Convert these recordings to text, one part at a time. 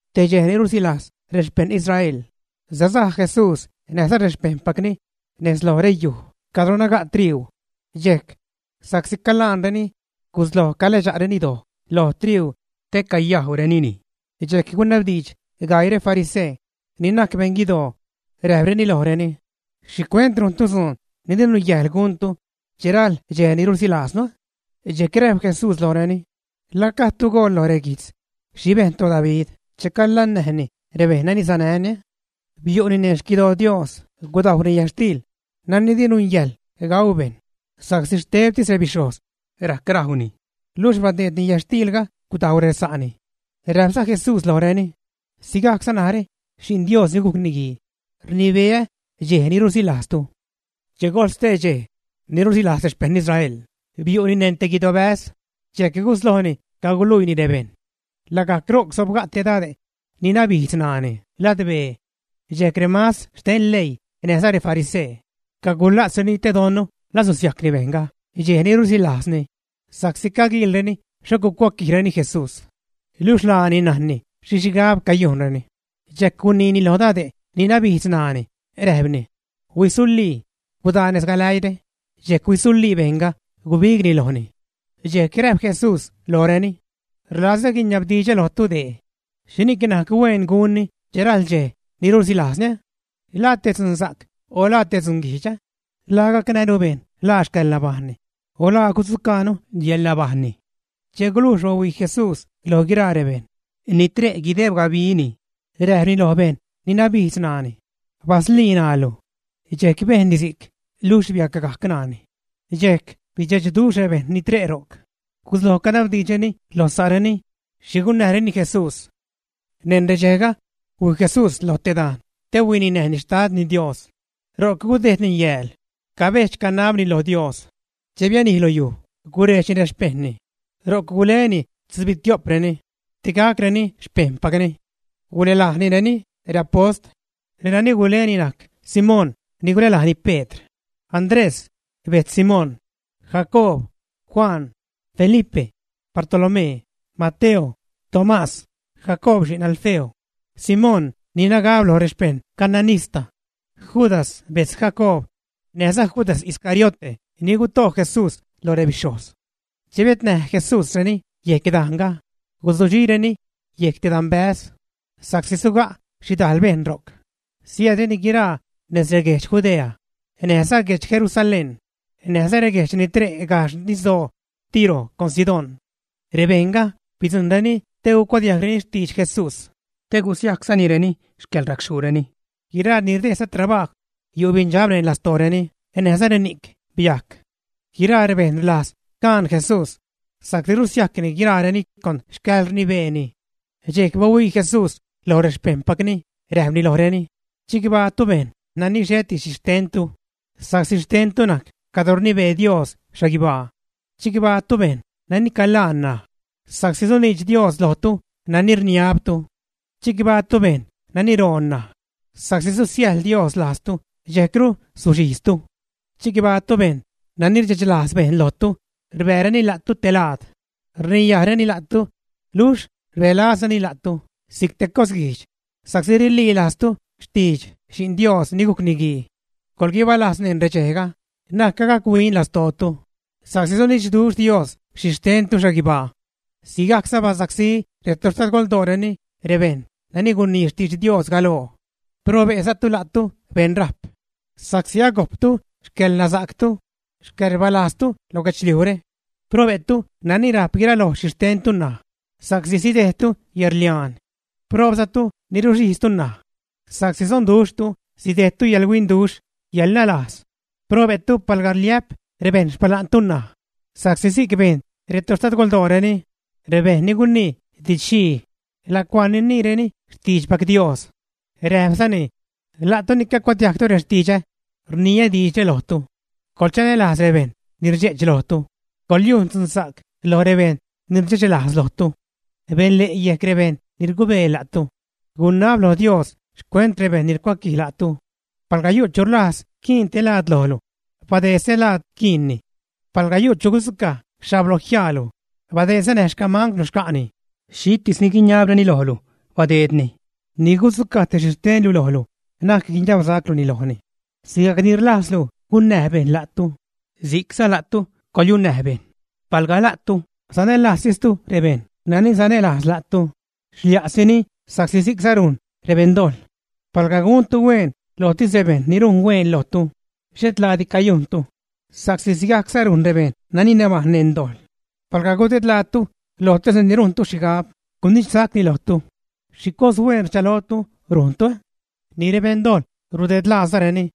Te dxej ni rusilajz rexpejṉ Israel sasaj Jesús näjza rexpejṉpacni nez loj reyuj cadro naga' triuu. Dxejc, sa'csi calaanreni gusloj caläädxreni doj lo triuu te cayajwrenini. Dxejc gunabdiidx gaii refarisee ni najc beṉguidoo, räjpreni lojreni: ―¿Xhicuent rujntu dzuun ni di nungäjḻ guntu che rajl dxej ni rusilajznu? Dxejc räjp Jesús lojreni: ―¿La gajdtu goḻ loj reguijtz xhi bejn toDavid cheni calannäjni rebejṉ nani sanäni, ä? Biu'ni neṉ xquidoo Dios, gudajwni yätxtiil nani di nungäjḻ gau bejṉ sa'csi xtebtis rebixhojz rajc rajwni, luxh badeedni yätxtiilga gudajw resa'ni. Räjpza Jesús lojreni: ―Sigajcza narä, Xi'n Dios ni gujc Niguii, rnibeä dxej ni rusilajztu. Che gojl stee dxej ni rusilajz rexpejṉ Israel, biu'ni neṉ te guidobäz, dxejc guslojni caguluiini rebejṉ. Lagajc ro'c sobga' te dade' ni nabijdz ṉaani ladbee. Dxejc remastr xten leii näjza refarisee cagula'tzreni te don la susiajcni bejṉga dxej ni rusilajzreni, sa'csi caguiilreni xho gucuaquijreni Jesús. Niluxh laani najnni xhi xhigab cayujnreni, dxejc guniini lo dade' ni nabijdz ṉaani, räjpni: ―¡Huisulii! ¡Gudaa nez galäiire! Dxejc huisulii bejṉga, gubigni lojni. Dxejc räjp Jesús lojreni: ―Rlazä guiniabdidxä lojtu dee: ¿Xhini'c najc huen gunni che rajl dxej ni rusilajznu? ¿La te dzunsa'c o la te dzunguijdx? ¿La gacnäjnu bejṉ ḻaa xcäḻnabajṉni o la gudzucajnu yäḻnabajṉni, ä? Che gulujx bahuii Jesús loj guiraa rebejṉ ni tre' guideb gabini, räjpni loj bejṉ ni nabijdz ṉaani: ―¡Baslii ṉaalu! Dxejc bejnni si'c, luxh biacgajc ṉaani. Dxejc bidxechduxh rebejṉ ni tre' ro'c, gusloj canabdiidxreni lo sa'reni xhi gunnäjreni Jesús. Neṉ redxejga, huij Jesús loj te dajn te huininäjni Xtadni Dios. Ro'c gudejdni yääl cabedx-canabni lo Dios. Che bianij lo yuj, gurejdxni rexpejṉni. Ro'c guleni tzubitio'preni te gacreni xpejṉpacni. Gulälajnireni reapost. Renani guleni najc Simón ni gulälajni Pedr; Andrés, bejtz Simón; Jacoob; Juan; Felipe; Bartolomé; Mateo; Tomás; Jacoob xi'n Alfeo; Simón ni nagab loj rexpeṉ cananista; Judas, bejtz Jacoob; näjza Judas Iscariote ni guto' Jesús loj rebixhojz. Che biätnäj Jesúsreni yejc dajnga, guzudxireni yejc te danbäz sa'csi suga' xhidajl bejṉ ro'c. Siäädreni guiraa nez reguedx Judea, näjza guedx Jerusalén näjza reguejdx ni tre' gajxh nisdoo Tiro con Sidón. Rebejṉga bidzujṉreni te gucuadiajgreni xtidx Jesús, te gusiajczanireni xcäḻracxhuureni. Guiraa ni rdejdza trabajw yu' beṉdxab neṉ lastooreni näjza reni'c biajc. Guiraa rebejṉ rlajz caan Jesús, sa'csi rusiajcni guiraareni con xcäḻrnibeeni. Dxejc bahuii Jesús loj rexpejṉpacni räjpni lojreni: ―Chicbaatu, bejṉ nani xheti xhixtentu, sa'csi xtentu najc cadro rnibee Dios xhaguibaa. ’Chicbaatu, bejṉ nani calaan ṉaj, sa'csi suniidx Dios lojtu nani rniabtu. ’Chicbaatu, bejṉ nani roon ṉaj sa'csi susiäjḻ Dios lajztu dxejcru suxhijztu. ’Chicbaatu, bejṉ nani rdxechlajz bejṉ lojtu, rbääreni la'tu te laad, rniyajreni la'tu, luxh rbälazreni lajtu si'c te cos guijdx sa'csi rililajztu xtidx Xi'n Dios ni gujc Niguii. Coḻguibalajz neṉ redxejga, na'c gac-huin lastootu sa'csi sunidxduxh Dios xhi xtentu xhaguibaa. Sigajcza basacsí retoxtadgoldooreni rebejṉ nani gunii xtidx Dios galoo. ’Probe'zatu, la'tu beṉrajp, sa'csi agojptu xcäḻnasa'ctu, xcäḻrbalajztu lo guedxliujre. ’Probe'tu nani rajp guiraloj xhixtentu ṉaj, sa'csi sidejdtu yäḻrliaan. ’Proobzatu ni ruxhijztu ṉaj, sa'csi sonduxhtu sidejdtu yäḻhuinduxh, yäḻnalas. ’Probe'tu palga rliä'p rebejṉ xpala'ntu ṉaj, sa'csi si'c bejn retoxtadgoldooreni rebejṉ ni gunii didx-xhii lacuaa niniireni xtiidxpac Dios. Räjpzani: ―La'tu ni cacuadiajgtu rextidxä rniä diidxre lojtu: coḻchanälajz rebejṉ ni rdxe'ch lojtu, coḻyujn dzunsa'c loj rebejṉ ni rdxechlajz lojtu. Benle' yejc rebejṉ ni rgube la'tu. Gunab lo Dios xcuent rebejṉ ni rcuaquij la'tu. Palga yu' chu rlajz quiin te laad lojlu, badeedza stelaad quiinni. Palga yu' chu gudzucaj xhablojiaalu, badeedza näj xcamangwlu xca'ni. Xhitis ni guiniabreni lojlu, badeedni; ni gudzucaj te xhi xtenlu lojlu, na'c guiniabsacluni lojni. Sigajc ni rlajzlu gunnäj bejṉ la'tu, si'cza la'tu coḻyennäj bejṉ. ’Palga la'tu sanälajztistu rebejṉ nani sanälajz la'tu, xlia'sini, sa'csi sigajcza rujn rebeṉdojḻ. Palga guntu hueen lojtis rebejṉ ni rujn hueen lojtu, xhet laadi cayujntu, sa'csi sigajcza rujn rebejṉ ni nabajṉ neṉ dojḻ. Palga gudedlaatu lojtis reni rujntu xhigab gunidxsacni lojtu, ¿xhi cos hueen rchalotu rujntu? Ni rebeṉdojḻ rudedlaazareni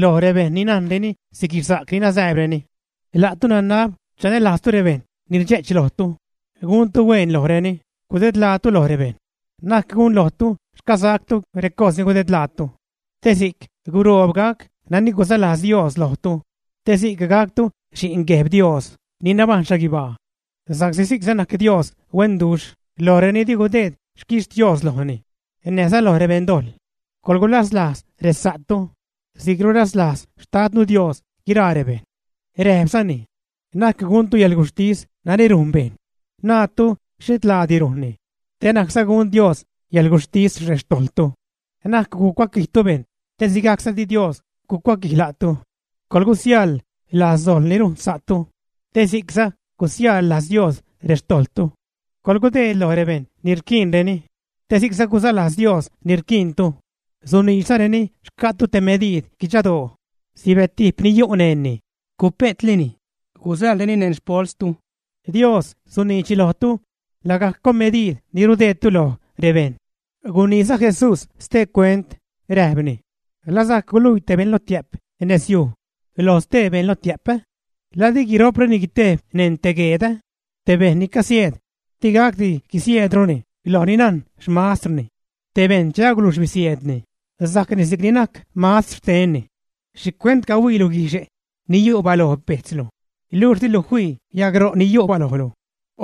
loj rebejṉ ni najnreni siguixsac ni nasääbreni. La'tu, nanab chanälajztu rebejṉ ni rdxe'ch lojtu, guntu hueen lojreni, gudedlaatu loj rebejṉ, na'c gunlojtu xcasactu recos ni rudedlaatu, te si'c guroob gac nani guzalajz Dios lojtu; te si'c gactu xi'n Gueb Dios ni nabajṉ xhaguibaa. Sa'csi si'cza najc Dios huenduxh loj reni di gudeed xquixtios lojni, näjza loj rebeṉdojḻ. Coḻgulaslajz resa'tu si'c rulaslajz Xtadnu Dios guiraa rebejṉ. Räjpzani: ―Na'c guntu yäḻguxhtis nani rujn bejṉ, naatu xhet laadi rujnni; te na'cza gun Dios yäḻguxhtis rextojḻtu. Na'c gucuaquijtu bejṉ te sigajcza di Dios gucuaquij la'tu. Coḻgusiäjḻ-lajz dojḻ ni rujn sa'tu, te si'cza gusiäjḻ-lajz Dios rextojḻtu. Coḻgudeed loj bejṉ ni rquiinreni te si'cza guzalajz Dios ni rquiintu. Suniidxreni xca'tu te mediid guidxadoo, sibetijp ni yu' neṉni, cupe'tlini gusäḻreni neṉ xpolstu. Dios suniidx lojtu lagajc con mediid ni rudeedtu loj rebejṉ. Guniiza Jesús stee cuent räjpni: ―¿La sajc guluii te beṉ lotiä'p nez yuj lo stee beṉ lotiä'p, ä? ¿La di guiro'preni guitejb neṉ te gueed, ä? Te bejṉ ni casieed di gacdi guisieedruni loj ni najn xmastrni. Te bejṉ, che agulujx bisieedni, sajcni si'cni najc mastr xtenni. ’¿Xhicuent cahuiilu guixhe' ni yu' baloj bejtzlu, luxh dilu fii yagro ni yu' balojlu?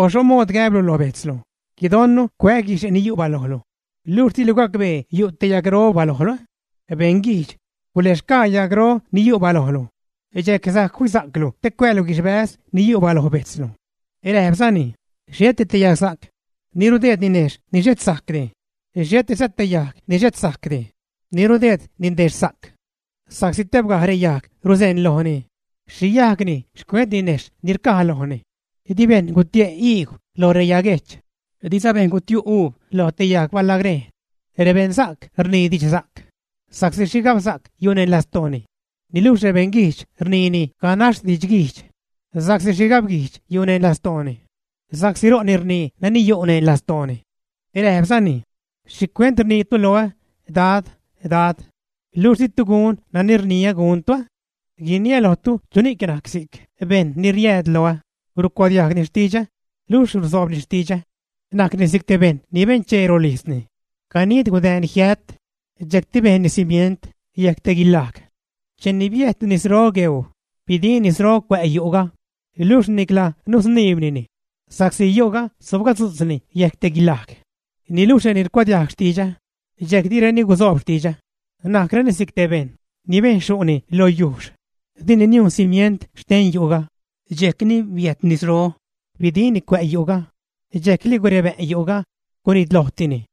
O, ¿xho mood gäblu lo bejtzlu: “Guidon cuää́ guixhe' ni yu' balojlu”; luxh dilu gacbee yu' te yagro balojlu, ä? ¡Beṉguijdx! Guläxgaa yagro ni yu' balojlu, dxejc sajc fisa'clu te cuäälu guixhbäz ni yu' baloj bejtzlu. Räjpzani: ―Xheti te yagsa'c ni rudeed ninejxh ni xhet sajcdi, xhetiza te yajg ni xhet sajcdi ni rudeed ninexhsa'c. Sa'csi tebgaj reyajg ruseṉlojni xhi yajgni xcuent ninejxh ni rcaj lojni. Di bejṉ gutie' iigw lo reyaguejch, diza bejṉ gutiu' uub lo te yag balagrejn. Rebeṉsa'c rnii didxsa'c, sa'csi xhigabsa'c yu' neṉ lastooni. Niluxh rebeṉguijdx rnii ganax didxguijdx sa'csi xhigabguijdx yu' neṉ lastooni, sa'csi ro'ni rnii nani yu' neṉ lastooni. Räjpzani: ―¿Xhicuent rniitu loä: “Dad, Dad,” luxh ditu gun nani rniä guntu? Guiniä lojtu chuni'c najc si'c bejṉ ni riääd loä, rucuadiajgni xtidxä luxh rusoobni xtidxä. Najcni si'c te bejṉ ni benchee rolijzni, ganid gudäänni jiät, dxejcti bejnni cimient yejc te guilaj. Cheni biäjt nisro ro' gueuu, bidijn nisro cuä' yu'ga, luxh nicla nusniibnini, sa'csi yu'ga sobgadzu'tz yejc te guilaj. Niluxh reni rcuadiajg xtidxä, dxejc direni guzoob xtidxä, najcreni si'c te bejṉ ni bejn xyu'ni loj yujxh, dini niujn cimient xten yu'ga. Dxejcni biäjt nisro, bidijnni cuä' yu'ga, dxejc li gurebä'n yu'ga, gunitlojtini.